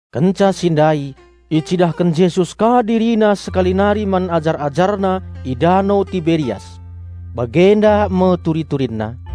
Kenca si ndai icidahken Jesus ka DiriNa sekali nari man ajar-AjarNa i Dano Tiberias. Bagenda me turi-turinna: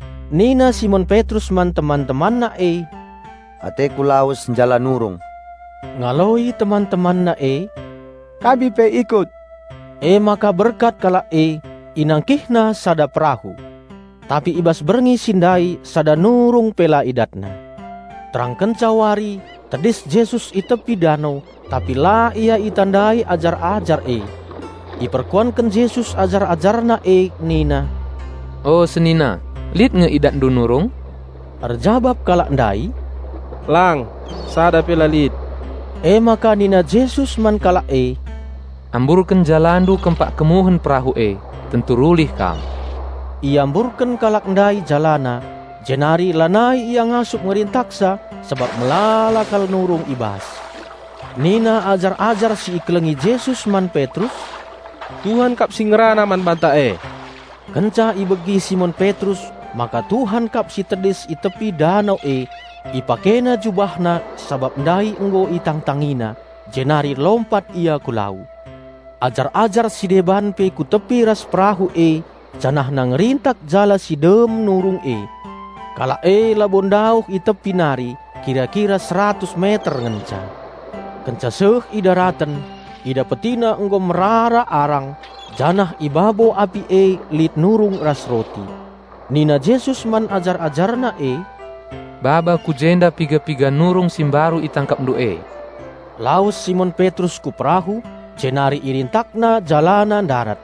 nina Simon Petrus man teman-temanna e, "Ateku lawes njala nurung." Ngaloi teman-temanna e, "Kami pe ikut." Emaka berkat kalak e, inangkihna sada perahu. Tapi i bas berngi si ndai sada nurung pe la idatna. Terangkenca wari, tedis Jesus i tepi dano; tapi la Ia itandai ajar-ajar e. Iperkuanken Jesus ajar-AjarNa e nina, "O senina, lit nge idatndu nurung?" Erjabap kalak ndai, "Lang, sada pe la lit." Emaka nina Jesus man kalak e, "Amburken jalandu kempak kemuhen perahu e, tentu rulih kam." Iamburken kalak ndai jalana, jenari lanai ia ngasup ngerintaksa sabap melala kal nurung i bas. Nina ajar-ajar si ikelengi Jesus man Petrus, "Tuhan kap si ngerana man banta e!" Kenca ibegi Simon Petrus maka Tuhan kap si tedis i tepi dano e, ipakena jubahna (sabap ndai nggo itangtangina) jenari lompat ia ku lau. Ajar-ajar si deban pe ku tepi ras perahu e janahna ngerintak jala si dem nurung e. Kalak e labo ndauh i tepi nari; kira-kira seratus meter ngenca. Kenca seh i daraten, idapetina nggo merara arang, janah i babo api e lit nurung ras roti. Nina Jesus man ajar-AjarNa e, "Baba ku jenda piga-piga nurung si mbaru itangkapndu e." Lawes Simon Petrus ku perahu, jenari irintakna jalana ndarat.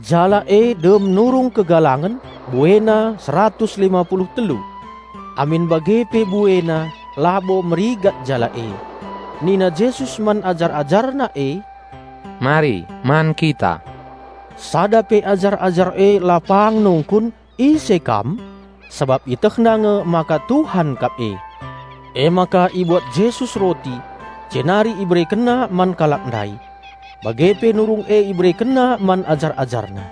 Jala e dem nurung kegalangen, buena seratus lima pulu telu. Amin bage pe buena, labo merigat jala e. Nina Jesus man ajar-AjarNa e, "Mari, man kita." Sada pe ajar-ajar e la pang nungkun, "Ise Kam?" Sabap ietehna nge maka Tuhan kap e. Emaka ibuat Jesus roti, jenari IberekenNa man kalak ndai. Bage pe nurung e IberekenNa man ajar-AjarNa.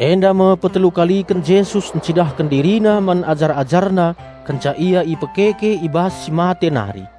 Enda me petelu kaliken Jesus ncidahken DiriNa man ajar-AjarNa kenca Ia ipekeke i bas si mate nari.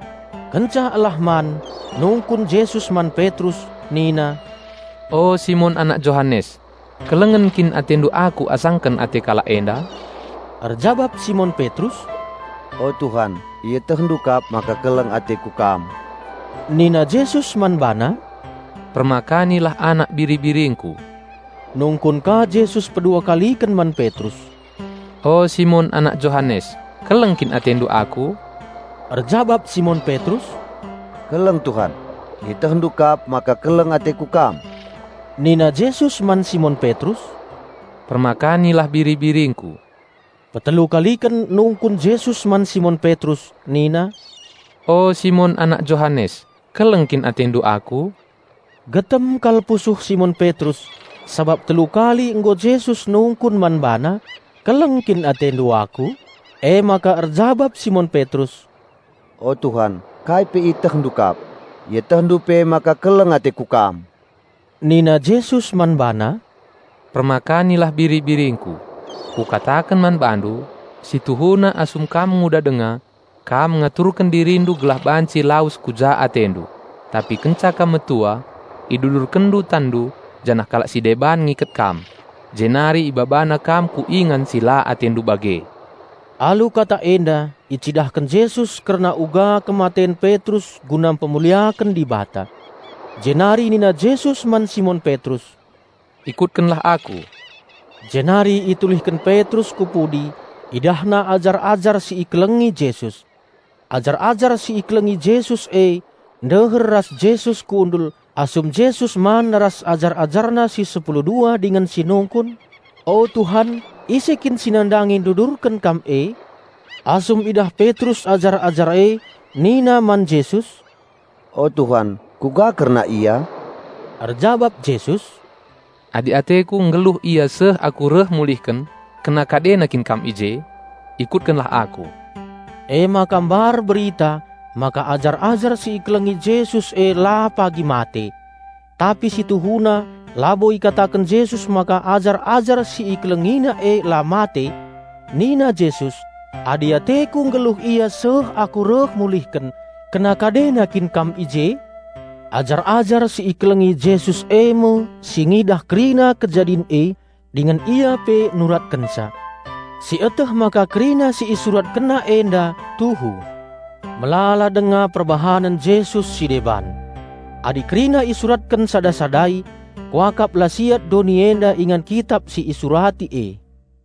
Kenca elah man, nungkun Jesus man Petrus nina, "O Simon anak Johanes, kelengen kin atendu Aku asaken ate kalak enda?" Erjabap Simon Petrus, "O Tuhan, ietehndu kap maka keleng ateku Kam." Nina Jesus man bana, "Permakanilah anak biri-biringKu." Nungkun ka Jesus pedua kaliken man Petrus, "O Simon, anak Johanes, keleng kin atendu Aku?" Erjabap Simon Petrus, "Keleng Tuhan, IetehNdu kap maka keleng ateku Kam." Nina Jesus man Simon Petrus, "Permakanilah biri-biringKu." Petelu kaliken nungkun Jesus man Simon Petrus nina, "O Simon, anak Johanes, keleng kin atendu Aku?" Getem kal pusuh Simon Petrus sabap telu kali nggo Jesus nungkun man bana, "Keleng kin atendu Aku?" Emaka erjabap Simon Petrus, "O Tuhan, kai pe IetehNdu kap. IetehNdu pe maka keleng ateku Kam!" Nina Jesus man bana, "Permakanilah biri-biringKu. Kukataken man bandu: Si tuhuna asum kam nguda denga, kam ngaturken dirindu gelah banci lawes ku ja atendu, tapi kenca kam metua, idudurkenndu tanndu janah kalak si deban ngiket kam, jenari ibabana kam ku ingan si la atendu bage." (Alu kata enda icidahken Jesus kerna uga kematen Petrus guna mpemuliaken Dibata.) Jenari nina Jesus man Simon Petrus, "Ikutkenlah Aku!" Jenari itulihken Petrus ku pudi; idahna ajar-ajar si ikelengi Jesus. Ajar-ajar si ikelengi Jesus, e ndeher ras Jesus kundul asum Jesus man ras ajar-AjarNa si sepulu dua dingen si nungkun, "O Tuhan ise kin si nandangi ndudurken Kam e?" Asum idah Petrus ajar-ajar e nina man Jesus, "O Tuhan kuga kerna ia?" Erjabap Jesus, "Adi ateKu nggeluh ia seh Aku reh mulihken, kena kadena kin kam i je? Ikutkenlah Aku!" Emaka mbar berita maka ajar-ajar si ikelengi Jesus e la pagi mate. Tapi si tuhuna labo ikataken Jesus maka ajar-ajar si IkelengiNa e la mate! Nina Jesus, "Adi ateKu nggeluh ia seh Aku reh mulihken, kena kadena kin kam i je?" Ajar-ajar si ikelengi Jesus e me si ngidah kerina kejadin e dingen ia pe nuratkenca. Sieteh maka kerina si isuratkenna enda tuhu. Melala denga perbahanen Jesus si deban. Adi kerina isuratken sada-sadai, kuakap la siat doni enda ingan kitap si isurati e.